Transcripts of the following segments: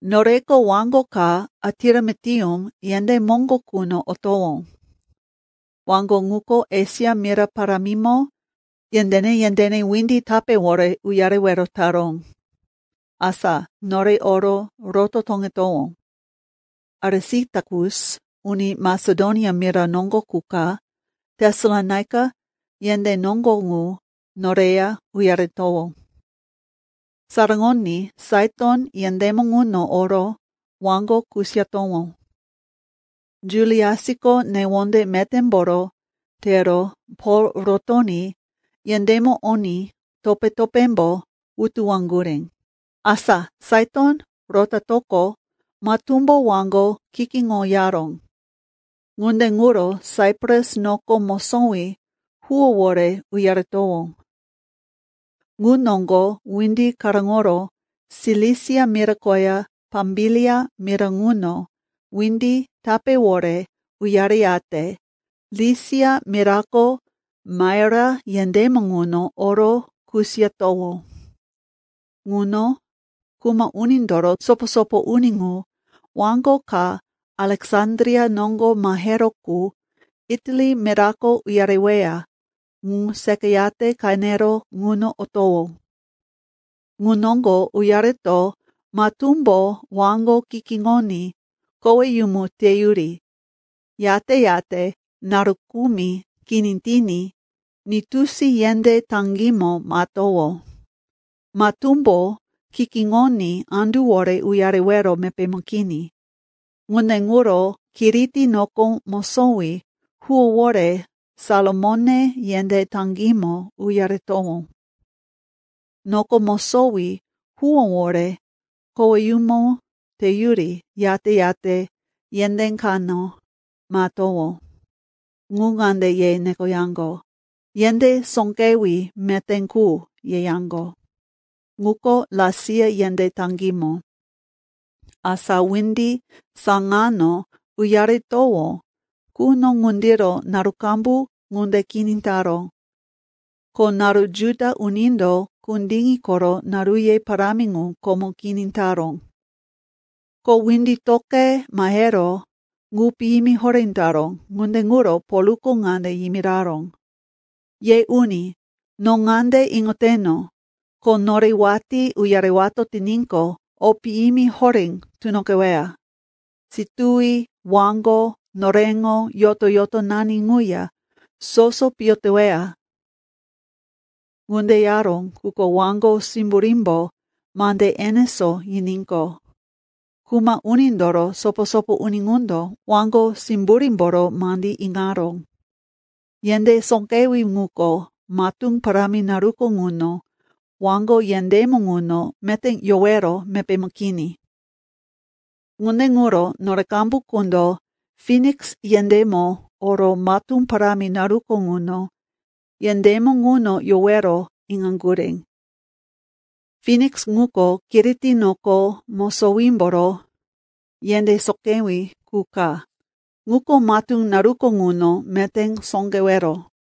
Noreko waŋgo ka Atiramitium yendé moŋgo quno otowó. Waŋgo ŋuko Esia mira parámimo yendéne-yendéne windi tapéwore uyarewero taró. Asa, nore oro roto toŋetowó. Arisitakus, uni Masedonia mira noŋgo qu ka, Tesalonaika yendé noŋgo ŋu noreya uyaretowó. Saraŋoní Saiton yendémo ŋuno oro waŋgo kusiyatowó. Juliasko newonde metémboro tero Pol rotoní yendémo oní topé-topémbo wutuwaŋgurí. Asa Saiton rotatoqo, matúmbo waŋgo kikiŋoyaró. Ŋunde ŋuro Saipras noko mosowí huwówore uyaretowó. Ŋu noŋgo windi karóŋoro Silisia mira koya Pambilia mira ŋuno windi tapéwore uyareyate Lisia mirako Maira yendémo ŋuno oro kusiyatowó. Ŋuno kuma unindoro sopo-sopo uni ŋu waŋgo ka Aleksandria noŋgo maheró qu Itali mirako uyareweya ŋu seqayate qenero ŋuno otowó. Ŋu noŋgo uyareto matúmbo waŋgo kikiŋoní koweyumu teyuri, yate-yate naru kumi kini tiní Nitusi yendé taŋgímo mahetowó. Matúmbo kikiŋoní anduwore uyarewero mepémo kini. Ŋunde ŋuro Kiriti noko mosowí huwówore Salamone yendé taŋgímo uyaretowó. Noko mosowí huwówore koweyumu teyuri, yate-yate yendé kano mahetowó, ŋu ŋande ye nekoyaŋgo, “Yendé Sóqewí Meté Qu,” yeyaŋgo. Ŋuko Lasia yendé taŋgímo. Asa windi saŋano uyaretowó quno ŋundiro naru qambu ŋunde kini taró, ko naru Juda unindo kundiŋi koro naruye parámi ŋu komo kini taró. Ko windi toqe mahero ŋu piyimi horé taró, ŋunde ŋuro Polko ŋande yimiraró, “Ye uni, no ŋande iŋoteno, ko nore watí uyarewato tiníqo, o piyimi horé tunoqeweya. Situwi, waŋgo, noreŋo yoto-yotonani ŋuya soso piyo teweya.” Ŋunde yaró, quko waŋgo simburímbo mande enesó yiníqo, kuma unindoro sopo-sopo uni ŋundo waŋgo simburímboro mandí iŋaró. Yendé sóqewí ŋuko, matú parámi naruko ŋuno waŋgo yendémo ŋuno meté yowero mepémo kini. Ŋunde ŋuro nore qambu qundo Finiks yendémo oro matú parámi naruko ŋuno yendémo ŋuno yowero iŋaŋgurí. Finiks ŋuko Kiriti noko mosowímboro yendé sóqewí qu ka. Ŋuko matú naruko ŋuno meté sóqewero.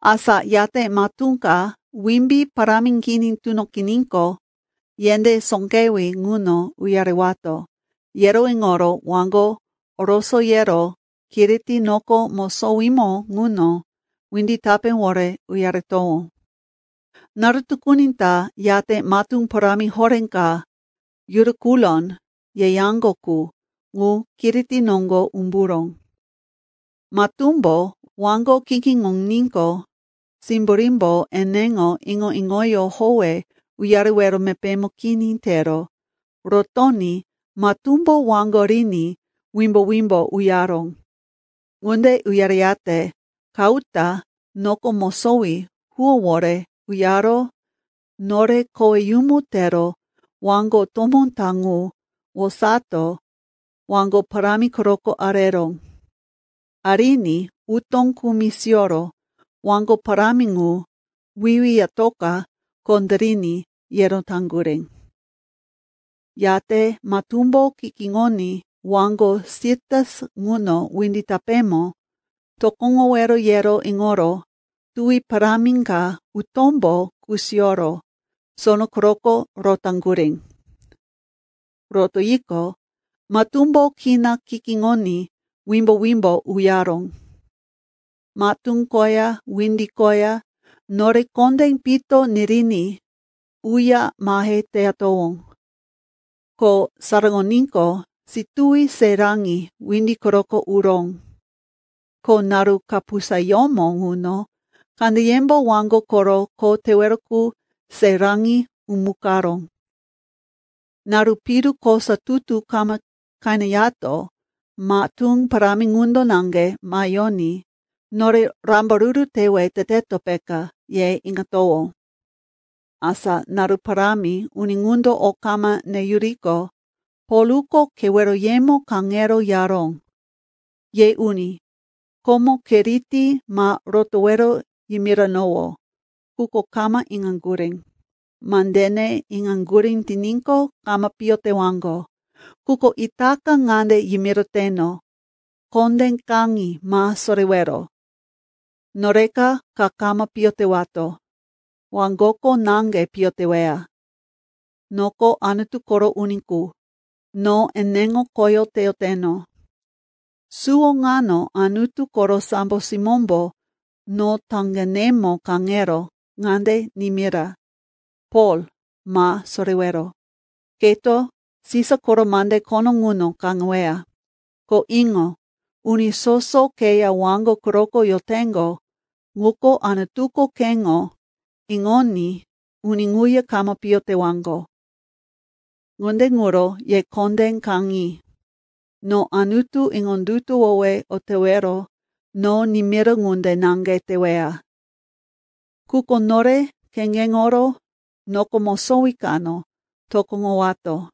Asa yate matú ka wimbí parámi kini tunoqiníqo, yendé sóqewí ŋuno uyarewato, yero iŋoro waŋgo orosoyero Kiriti noko mosowímo ŋuno windi tapéwore uyaretowó. Naru tukuni ta yate matú parámi horé ka “Yurakulon” yeyaŋgo qu, ŋu Kiriti noŋgo umburó. Matúmbo waŋgo kikiŋoníqo, simburímbo eneŋo iŋo-iŋoyó howe uyarewero mepémo kini tero rotoní matúmbo waŋgo riní wimbo-wimbo uyaró. Ŋunde uyareyate Kauta noko mosowí huwówore uyaro nore koweyumu tero waŋgo tomó ta ŋu wosato waŋgo parámi quroko areró. Ariní utó kumi siyoro waŋgo parámi ŋu wiwiyatoka kondériní, yero taŋgurí. Yate matúmbo kikiŋoní waŋgo Sirtis ŋuno windi tapémo tokoŋowero yero iŋoro tuwi parámi ka utómbo kusiyoro sono quroko rotaŋgurí. Rotoyiqo, matúmbo kina kikiŋoní wimbo-wimbo uyaró. Matú koya windi koya nore kondé pito niriní uya mahe teyatowó, ko saraŋoníqo, situwi se raŋi windi quroko uró. Ko naru kapusayómo ŋuno kandeyembo waŋgo koro kho tewero qu se raŋi umukaró. Naru piru kosa tutu kama qeneyato matú parámi ŋundo naŋge maheyoní, nore rambaruru tewe teteto, peka, ye iŋatowó. Asa naru parámi uni ŋundo o kama neyuriqo, Polko keweroyemo kaŋero yaró, “Ye uni, komo Kiriti ma rotowero yimiranowó, quko kama iŋaŋgurí. Mandene iŋaŋgurí tiníqo, kama piyo tewaŋgo. Quko itaka ŋande yimiroteno, kondé kaŋi, ma sorewero. Noreko ka kama piyo tewato. Waŋgoko naŋge piyo teweya. Noko Anutu koro uni qu, no eneŋo khoyó teyoteno. Suwo ŋano Anutu koro sambo simómbo no taŋgenemo kaŋero ŋande nimira, ‘Pol, ma sorewero. Keto Sisa koro mande khono ŋuno kaŋeweya. Ko iŋo, uni soso keya waŋgo quroko yoteŋgo ŋuko, Anutuko keŋo iŋoní uni ŋuya kama piyo tewaŋgo.’ Ŋunde ŋuro ye kondé kaŋi. No Anutu iŋondutuwowe o tewero no nimira ŋunde naŋge teweya. Quko nore kheŋgeŋoro noko mosowí kano tokoŋowato.”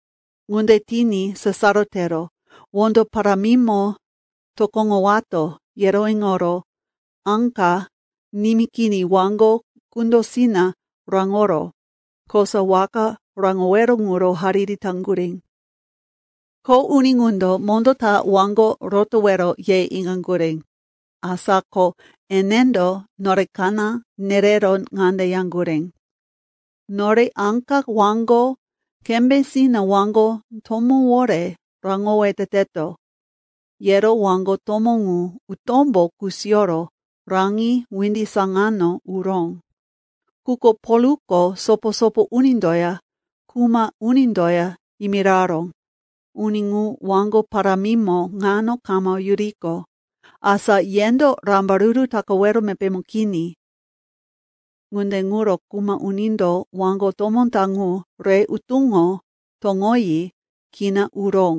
Ŋunde tiní sasaro tero wondo parámimo tokoŋowato, yero iŋoro áka nimí kini waŋgo kundósina raŋoro kosa waka raŋowero ŋuro hariri taŋgurí. Kho uni ŋundo mondó ta waŋgo rotowero ye iŋaŋgurí. Asa ko enendo nore kaná nerero ŋande yaŋgurí, “Nore áka waŋgo kembésina waŋgo tomówore raŋowe teteto,” yero waŋgo tomó ŋu utómbo kusiyoro raŋi windi saŋano uró. Quko Polko sopo-sopo unindoya kuma unindoya yimiraró, “Uni ŋu waŋgo parámimo ŋano kama yuriqo, asa yendo rambaruru takawero mepémo kini.” Ŋunde ŋuro kuma unindo waŋgo tomó ta ŋu re utóŋo toŋoyi kina uró.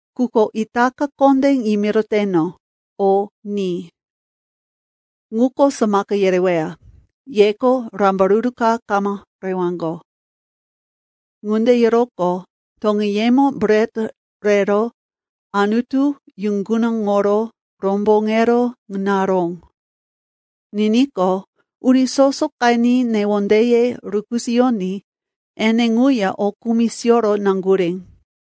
Quko itaka kondé yimiroteno, o ni. Ŋuko samaka yereweya. Yeko rambaruru ka kama rewaŋgo.” Ŋunde yeroqo, toŋeyemo bret rero Anutu yuŋgunaŋoro romboŋero naró. Niníqo, uni soso qeni newondeye rukisoyoní ene ŋuya o kumi siyoro naŋgurí.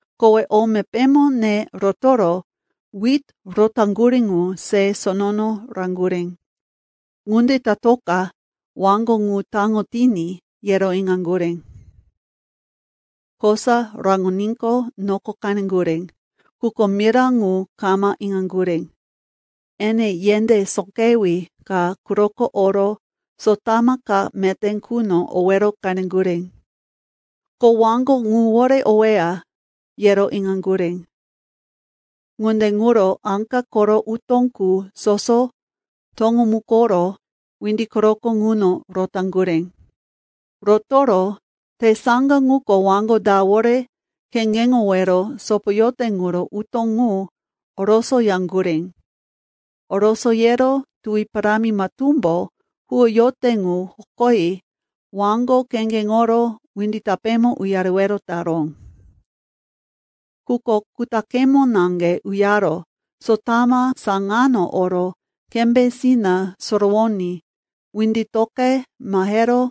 Kowe o mepémo ne rotoro wit rotaŋgurí ŋu se sonono raŋgurí, ŋunde tatoka waŋgo ŋu taŋo tiní, yero iŋaŋgurí. Kosa raŋoníqo, noko qeneŋgurí, quko mira ŋu kama iŋaŋgurí. Ene yendé sóqewí ka quroko oro sotama ka meté quno owero qeneŋgurí. Ko waŋgo ŋuwore oweya, yero iŋaŋgurí. Ŋunde ŋuro áka koro utó qu soso toŋomukoro windi quroko ŋuno rotaŋgurí. Rotoro tesaŋga ŋuko waŋgo dawore kheŋgeŋowero sopoyote ŋuro utó ŋu orosoyaŋgurí. Orosoyero tuwi parámi matúmbo huwoyote ŋu hokoyi waŋgo kheŋgeŋoro windi tapémo uyarewero taró. Quko kutaqemo naŋge uyaro sotama saŋano oro kembésina sorowoní windi toqe mahero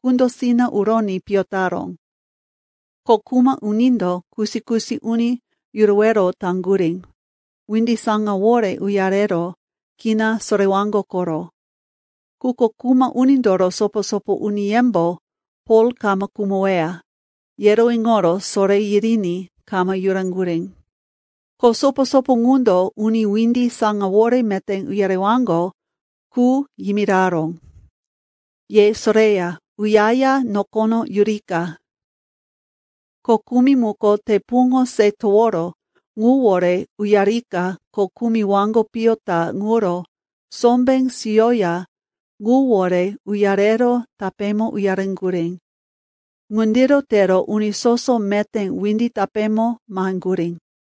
kundósina uroní piyo taró. Ko kuma unindo kusi-kusi uni yurowero taŋgurí, windi saŋawore uyarero kina sorewaŋgo koro. Quko kuma unindoro sopo-sopo uniyembo Pol kama khumoweya, yero iŋoro soré yiriní kama yuraŋgurí. Ko sopo-sopo ŋundo uni windi saŋawore meté uyarewaŋgo qu yimiraró, “Ye soreya uyaya nokono yurika.” Ko kumi muko te puŋo se toworo ŋuwore uyarika ko kumi waŋgo piyo ta ŋuro sombé siyoya ŋuwore uyarero tapémo uyareŋgurí. Ŋundiro tero uni soso meté windi tapémo maheŋgurí.